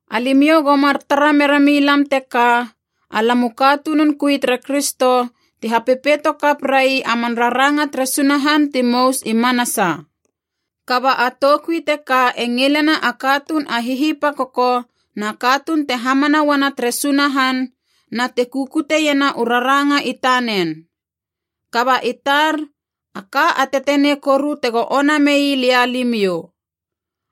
Alimiou go mar tara mera milam teka, alam u katunun kui tere Kristo, ti hapepeito kap rai a man raranga tere Sunahan ti mous i manasa. Kaba a toukui teka e ngilena a katuun a hihipakoko na katuun te hamana uana tere Sunahan na te kukuteiena u raranga i tanen. Kaba i tar, a ka a tetenei koru tego ona mei lia limiou.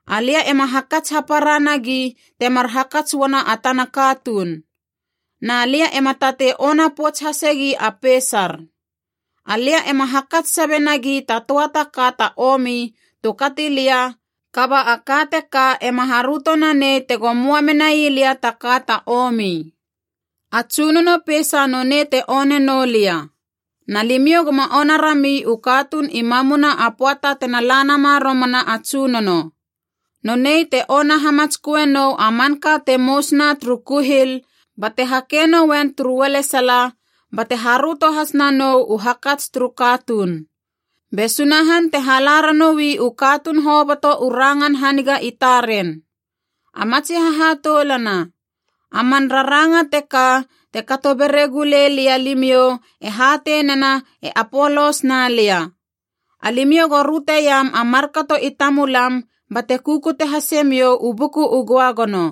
Alia ema hakats hapara nagi temar hakats uana a tana katuun. Na lia ema tatei ona pouts hasegi a peisar. Alia ema hakats sabe nagi ta töa ta ka ta omi tu kati lia, kaba a ka teka ema haröto nanei tego möa menai lia ta ka ta omi. A Tsunono peisa nonei te one noulia. Na limiou goma ona rami u katuun i mamuna a pöata tena la nama romana a Tsunono. Nonei te ona hamatsköe nou a manka te mousna turu kuhil bate hakei nouen turu ualesala, bate haröto has nanou u hakats turu katuun. Be Sunahan te hala ranoui u katuun hoboto u rangan haniga i taren. A matsi hahatoulana, a man raranga teka te kato beregu lei lia limiou e hatei nena e Apolos na lia. Alimiou go röteiam a markato i tamulam bate kukute hasemiou u Buku u Göagono.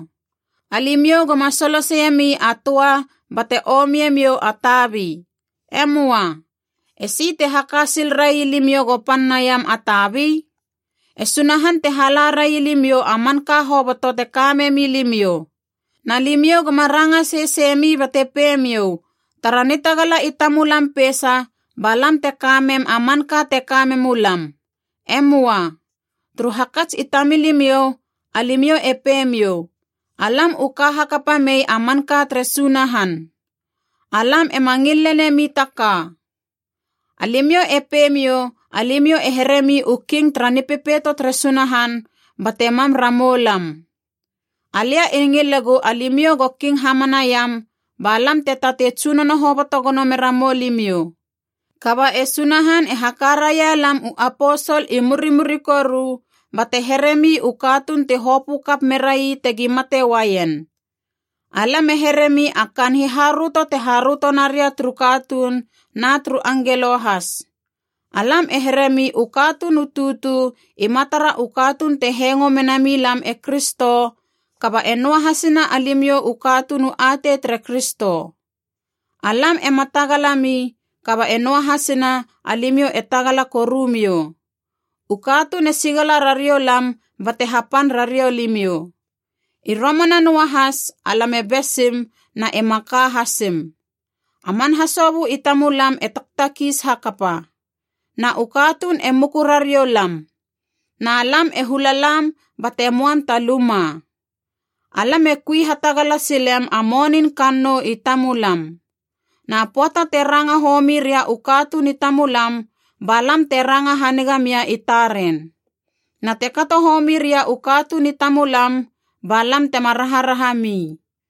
Alimiou goma soloseiemi a töa bate omiemiou a tabi. E möa. Esi te haka sil rai limiou go pan naiam a tabi? E Sunahan te hala railimiou a manka hoboto te ka memi limiou. Na limiou goma ranga seseimi bate peimiou, tara nitagala i tamulam peisa ba lam te ka mem a manka te ka memu lam. E möa. Turu hakats i tamilimiou, alimiou e peimiou, “Alam u ka hakapa mei a manka tere Sunahan. Alam ema ngil lenemi taka.” Alimiou e peimiou alimiou e heremi u king tara nipepeito tere Sunahan bate mam ramou lam. Alia e ngilegu alimiou go king hamanaiam, ba lam te tatei tsunono hoboto gono mera moulimiou. Kaba e Sunahan e haka raia lam u aposol i murimuri koru, bate heremi u katuun ti hopö kap merai tegi mate uaien. Alam e heremi a kaan hiharöto te haröto naria turu katuun na turu angelo has. Alam e heremi u katuun u tutu i matara u katuun te hengo mena milam e Kristo, kaba e noahasina alimiou u katuun u atei tere Kristo. Alam ema tagalami, kaba e noahasina alimiou e tagala korumiou. U katuun e sigala rariou lam bate hapan rariou limiou. I romana noahas alam e besim na e maka hasim. A man hasobö i tamulam e taktakiis hakapa. Na u katuun e muku rariou lam. Na lam e hula lam bate möam ta luma. Alam e kui hatagala silem a monin kannou i tamulam. Na pöata te ranga homi ria u katuun i tamulam, ba lam te ranga haniga mia i taren. Na te kato homi ria u katuun i tamulam, ba lam tema raharahami.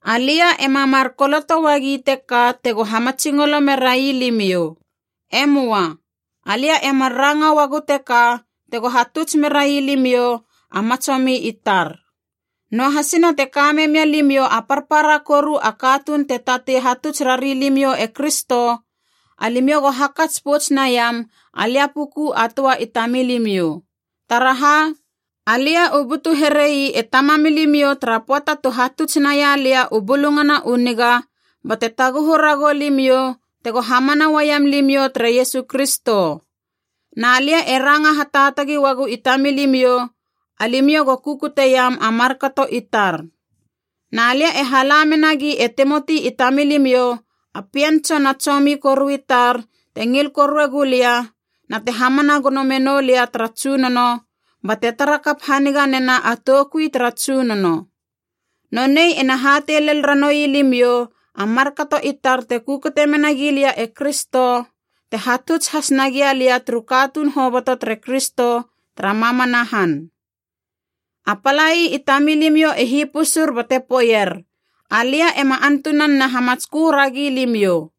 Alia ema mar koloto uagi teka tego hamatsingolo merai limiou. E möa. Alia e mar ranga uagu teka tego hatuts merai limiou, a matsomi i tar. Noahasina te ka memia limiou a parpara koru a katuun te tatei hatuts rari limiou e Kristo, alimiou go hakats pouts naiam alia puku a töa i tamamilimiou. Taraha, alia u butu here ii e tamamilimiou tara pöata tu hatuts naia lia u Bulungana u Niga bate taguhu ragou limiou tego hamana uaiam limiou tere Iesu Kristo. Na lia e ranga hataatagi uagu i tamilimiou, alimiou go kukuteiam a markato i tar. Na lia e hala menagi e Timoti i tamilimiou, a pien tsona a tsomi koru i tar te ngil korue gulia na te hamana gono menou lia tara Tsunono bate tara kap haniga nena a toukui tara Tsunono. Nonei ena hatei lel ranoui limiou a markato i tar te kukute mena gilia e Kristo, te hatuts has nagia lia turu katuun hoboto tere Kristo tara mamana han. A palai i tamilimiou e hipusur bate poeier alia ema antunan na hamatskö ragi limiou.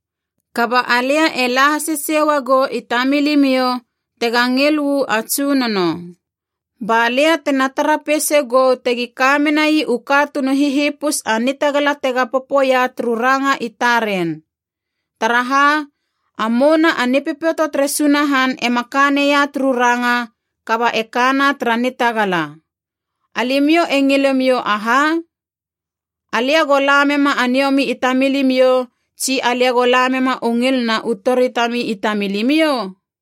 Kaba alia e la hasesei uagou i tamilimiou tega ngil u a Tsunono. Ba lia tena tara peisa gou tegi ka menai u katuun u hihipus a nitagala tega popoia turu ranga i taren. Taraha, a mouna a Nipepeito tere Sunahan ema ka neia turu ranga, kaba e kana tara nitagala. Alimiou e ngilemiou aha? Alia go la mema a niomi i tamilimiou tsi alia go la mema u ngil na u tori tami i tamilimiou?